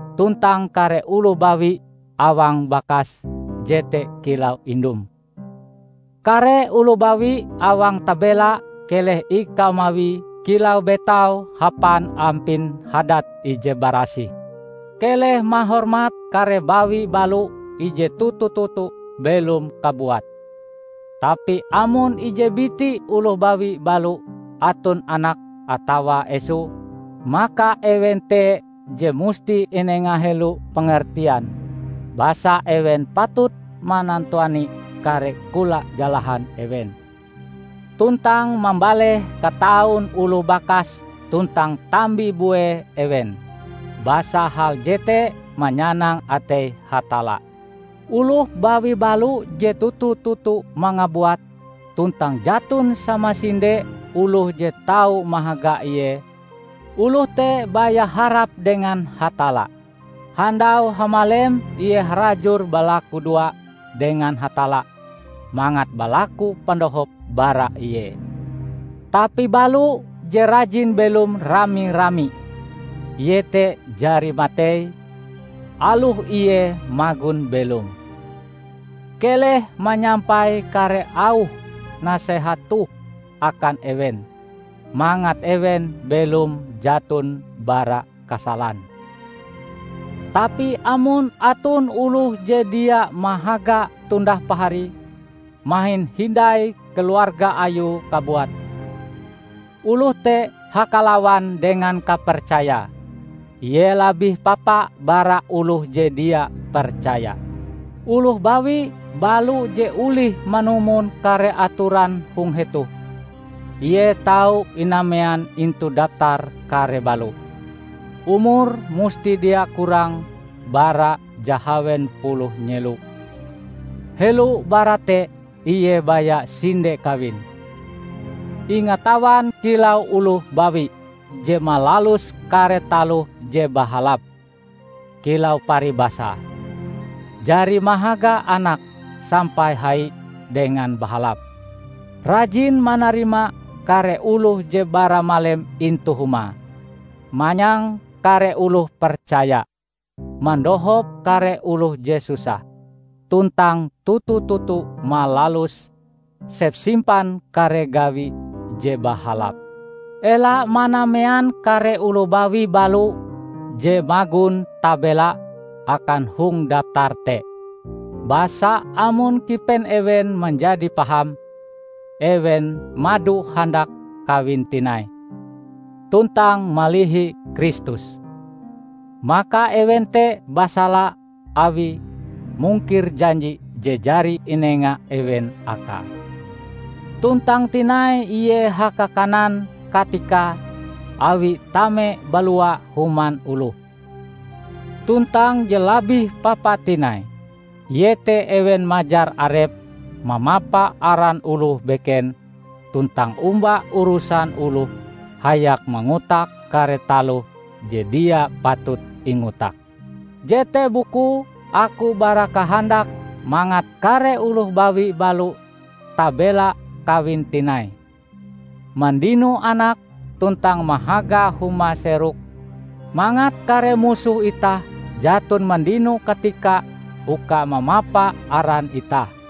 tuntang kare oloh bawi awang bakas jete kilau indum. Kare oloh bawi awang tabela keleh ikau mawie kilau betaum hapan ampin hadat ije barasih. Keleh mahormat kare bawi balo ije toto-toto belom kabuate. Tapi amon ije biti oloh bawi balo aton anake atawa esoe, maka ewen te je musti inenga helo pengertian basa ewen patut manantuani kare kola jalahan ewen, tuntang mambaleh kataun oloh bakas tuntang tambi-bue ewen. Basa hal jete manyanang atei Hatalla. Oloh bawi balo je toto-toto mangabuat, tuntang jaton samasinde oloh je tau mahaga ie, oloh te baya harap dengan Hatalla. Handau hamalem ie harajur balakudoa dengan Hatalla mangat balaku pandohop bara Ie. Tapi balo je rajin belom rami-rami, ie te jari matei aloh ie magon belom. Keleh manyampai kare auh nasehat toh akan ewen, mangat ewen belom jaton bara kasalan. Tapi amon aton oloh je dia mahaga tundah paharie, mahin hindai keluarga ayue kabuat, oloh te hakalawan dengan kapercayae; ie labih papa bara oloh je dia percaya. Oloh bawi balo je olih manumon kare atoran hong hetoh, ie tau inamean intu daptar kare balo: umure musti dia kurang bara jahawen puluh nyelo, helo bara te ie baya sinde kawin, ingatawan kilau oloh bawi je malalus kare taloh je bahalap, kilau paribasae: jari mahaga anake sampai hai dengan bahalap, rajin manarima kare oloh je baramalem intu humae, manyang kare oloh percaya, mandohop kare oloh je susah, tuntang toto-toto malalus sepsimpan kare gawi je bahalap. Ela manamean kare oloh bawi balo je magon tabela akan hong daptar te. Basa amon kipen ewen manjadi paham, ewen mado handak kawin tinai, tuntang malihi Kristus. Maka ewen te basala awie mungkir janji je jari inenga ewen akae. Tuntang tinai ie haka-kanan katikae awie tame balua human oloh. Tuntang je labih papa tinai, iete ewen majar arepe mamapa aran oloh beken tuntang omba urusan oloh hayak mangotak kare taloh je dia patut ingotak. Jete bukue aku barakahandak mangat kare oloh bawi balo tabela kawin tinai, mandino anak tuntang mahaga huma-seroke, mangat kare musoh itah jaton mandino katika uka mamapa aran itah.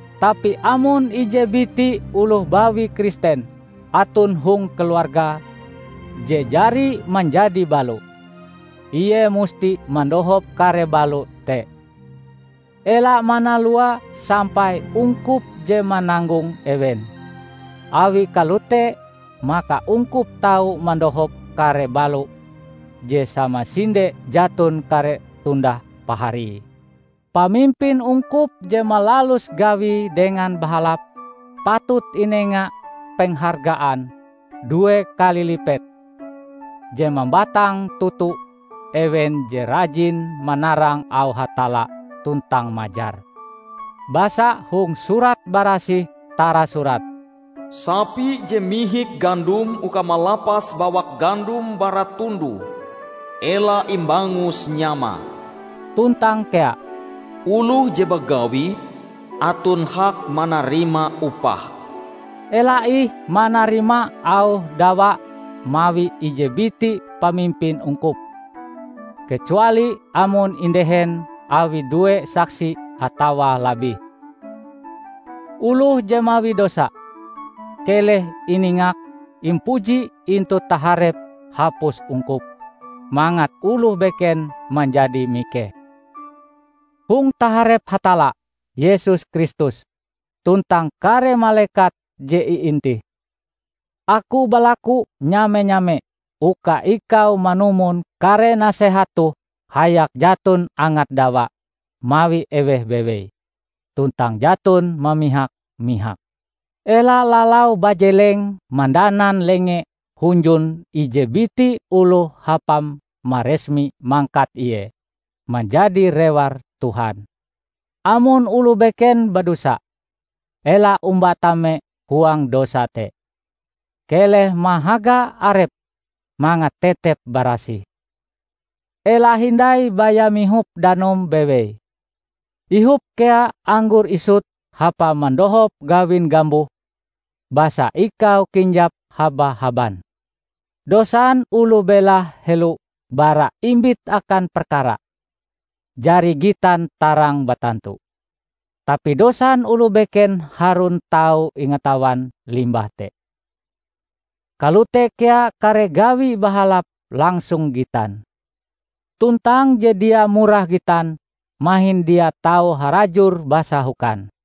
Tapi amon ije biti oloh bawi Kristen aton hong keluargae je jari manjadi balo, ie musti mandohop kare balo te. Ela manalua sampai ungkup je mananggong ewen. Awi kalote maka ungkup tau mandohop kare balo je samasinde jaton kare tundah paharie. Pamimpin ungkup je malalus gawie dengan bahalap, patut inenga penghargaan due kali lipet, je mambatang toto ewen je rajin manarang auh Hatalla tuntang majar. Basa hong Surat Barasih tarasurat, "Sapi je mihik gandom uka malapas bawak gandom bara tundoe, ela imbangus nyamae", tuntang kea, "Oloh je bagawi, aton hak manarima upahe". Ela ih manarima auh dawa mawi ije biti pamimpin ungkup, kecuali amon indehen awi due saksi atawa labih. Oloh je mawi dosa, keleh iningak impuji intu taharep hapus ungkup, mangat oloh beken manjadi mikeh. Hong taharep Hatalla, Yesus Kristus, tuntang kare malekat je iintih, aku balaku nyame-nyame uka ikau manumon kare nasehat toh hayak jaton angat dawa mawi eweh bewei, tuntang jaton mamihak-mihak. Ela lalau bajeleng mandanan lenge hunjun ije biti oloh hapam maresmi mangkat ie manjadi rewar Tuhan. Amon oloh beken badosa, ela omba tame huang dosa te. Keleh mahaga arepm mangat tetep barasih. Ela hindai baya mihop danum bewei; ihop kea anggor isut hapa mandohop gawin gambuhm, basa ikau kinjap haba-haban. Dosan oloh belahe helo bara imbit akan perkara, jari gitan tarang batantu. Tapi dosan oloh beken harun tau ingatawan limbah te. Kalote kea kare gawi bahalap langsung gitan. Tuntang je dia murah gitan, mahin dia tau harajur basahokan.